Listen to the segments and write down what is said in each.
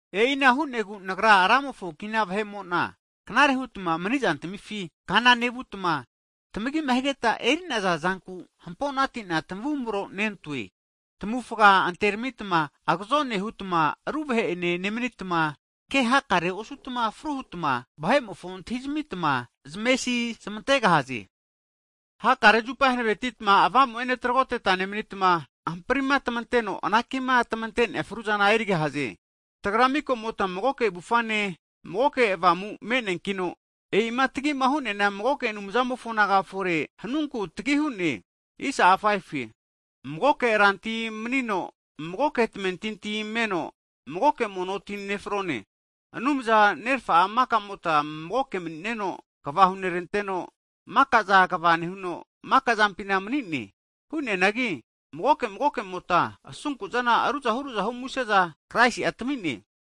E'ina hu'negu nagra Ramofo kina vahe'mo'na, knare hutma mani'zantamifi kana nevutma, tamagima higetma eri'naza zanku hampo'nati'na tamavumro nentoe. Tamavufga anteramitma, agazone hutma ru vahe'ene nemnitma, ke hakare osutma fru hutma, vahe'mofo antahizamitma zamesi zamantegahaze. Hakare zupa hanavetima Avamu'ene tragotetma nemanitma, hamprima tamanteno anaki'ma tamante'nea fruzana erigahaze. Tagra mika'mota magoke avufane, magoke Avamu me'neankino, e'ima tagi hu'neana magoke Anumzamofo naga fore hanunku tagi hu'ne. Magoke Rantia manino, magoke tamentinti meno, magoke mono ti nefrone. Anumza Nerfa'a maka'mota magoke mani'neno kva huneranteno, maka'za kva nehuno maka'zampina mani'ne. Hu'neanagi magoke magoke'mota asunku'zana ruzahu ruzahu muse'za Kraisi'a tami'ne.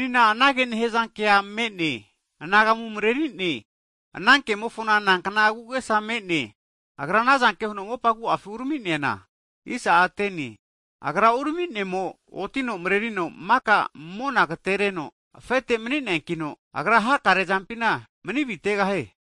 Menina anage nehzankea me'ne, anagamu mareri'ne, ana kemofona nankna agu'agesa me'ne, Agra anazanke huno mopa agu'afi urami'neana? Agra urami'nemo otino mrerino maka mona agtereno afete mani'neankino, Agra hakare zampina mani avitegahie.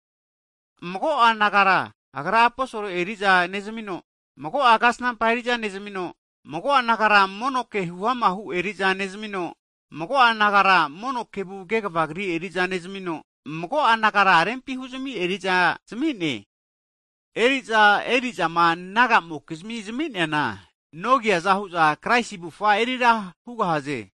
Mago'a nagara Agra aposol eri'za nezmino, mago'a nagara kasnampa eri'za nezmino, mago'a nagara mono ke huamahu eri'za nezmino, mago'a nagara mono kevu kegva kri eriza nezmino, mago'a nagara rempi huzmi eriza zami'ne. Eri'za erisaza'zama, naga'amokizmi (Saints) zami'neana, non kiaza hu'za Kraisi avufa eri ra hugahaze,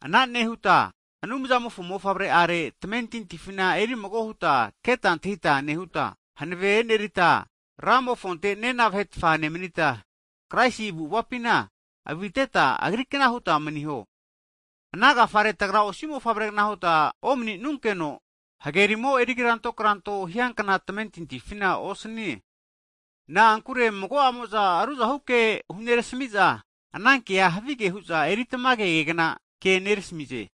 ana nehuta Anumzamofo Mofavre'are tamentintifina eri mago huta keta antahita nehuta, hanave enerita Ramofonte nena vahetfa nemnita, Kraisi avu'avapina aviteta Agri kna huta maniho. Ana agafare tagra osi mofavregna huta omni'nunkeno, hagerimo erikranto kranto hiankna tamentintifina osnie. Na'ankure mago'amo'za ruzahu ke hunerasmi'za, anankea havige hu'za eri tamage kegna ke nerasmize.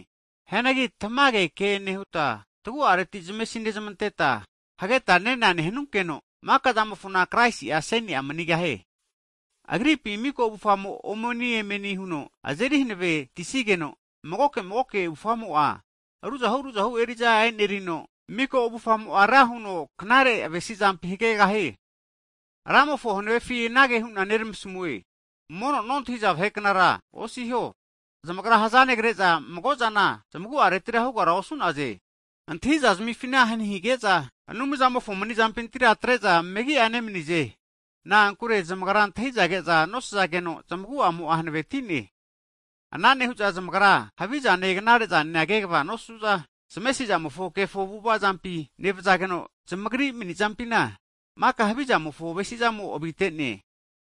Hianagi tamage ke nehuta, tagu'areti zamesi nezmanteta, hageta nena nehanunkeno maka'zamofona Kraisi aseni'a manigahie. Agripi miko avufamo omoni, emeni huno azeri hanavetisigeno, magoke magoke avufamo'a ruzahu ruzahu eri'za e'nerino, miko avufamo'a ra huno knare avesi'zampi hagegahie. Ramofo hanave'afi anage hu'na neramasamue, mono nontahiza vahe knara (Gentiles) osiho, zamagra hzanegre'za mago'zana zamagu'areti hugara osu'naze. Antahi'za zamifina hani hige'za, Anumzamofo mani'zampintira atre'za megi'a nemanize, na'ankure zamagra antahi'za ke'za nosazageno, zamagu'amo'a hanveti'ne. Ana nehu'za zamagra havizane knare'zane kegva nosu'za, zamesi'zamofo kefo avu'ava zampi nevazageno, zamagri mani'zampina maka havizamofo avesi'zamo avite'ne.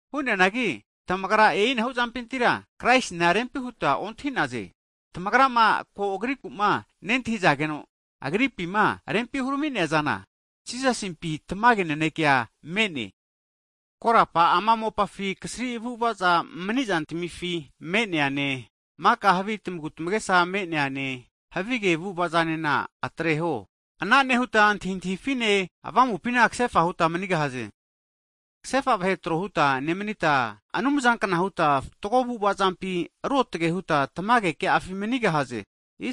Hu'neanagi tamagra, e'inahu zampintira Kraisina rempi huta ontahi'naze. Tamagrama ko Agriku'ma nentahizageno Agripima rempi hurami'nea zana, Jisasimpi tamage nanekea me'ne. Korapa ama mopafi kasri avu'avaza mani'zantamifi me'neane, maka havi tamagu tamagesa me'neane, havige avu'ava'zanena atreho. Ana nehuta antahintahifine, avamupi ksefa huta manigahaze. Ksefa vahe tro huta nemanita, Anumzankna huta fatgo avu'ava zampi ruotage huta tamage ke'afi manigahaze.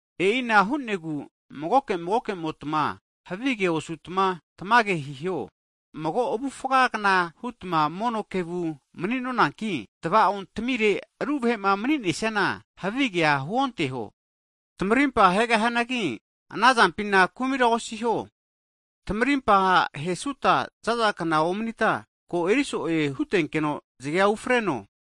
E'ina hu'negu magoke magoke'motma havige osutma tamage hiho. Mago avufagna hutma mono kevu mani'nonanki, tva'ontamire ru vahe'ma mani'nesiana havigea huonteho. Tamarimpa hegahianagi, ana zampina kumira osiho, tamarimpa hesuta zaza kna omanita ko eri so'e hutenkeno zge'a ufreno.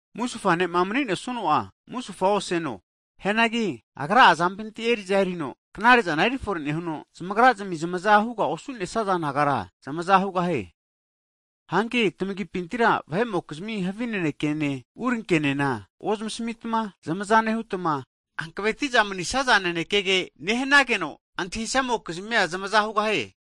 Musufa ne'ma mani nesuno'a musufa oseno. Hianagi agra azampinti eri'za erino knare'zana erifore nehuno, zamagrazmi zamaza huga osu'nesaza nagara zamaza hugahie. Hanki tamagipintira vahe'mokizmia havi nanekene urinke'nena ozmasmitma, zamaza nehutma, hanaveti'za manisaza nanekege nehnageno, antahisamokizmi'a zamaza hugahie.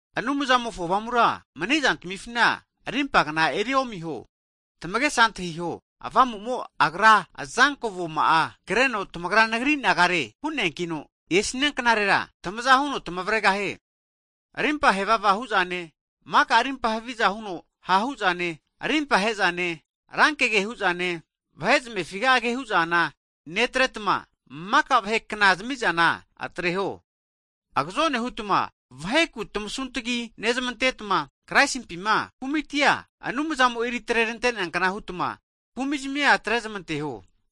Anumzamofo Avamura mani'zantmifina rimpagna eriomiho. Tmagesa antahiho, Avamu'mo agra azanko avoma'a kreno tamagra nagri nagare hu'neankino, esnia knarera tamaza huno tamavregahie. Rimpa hevava hu'zane, maka rimpa haviza huno ha' hu'zane, rimpa he'zane, rankege hu'zane, vahe zamefi'a ke hu'zana netretma, maka vahe kna zami'zana atreho. Agazone hutma vaheku tamasuntgi nezmantetma, Kraisimpi kumitia Anumzamo eri atre'rante'neankna hutma, kumi'zmia atre'zmanteho.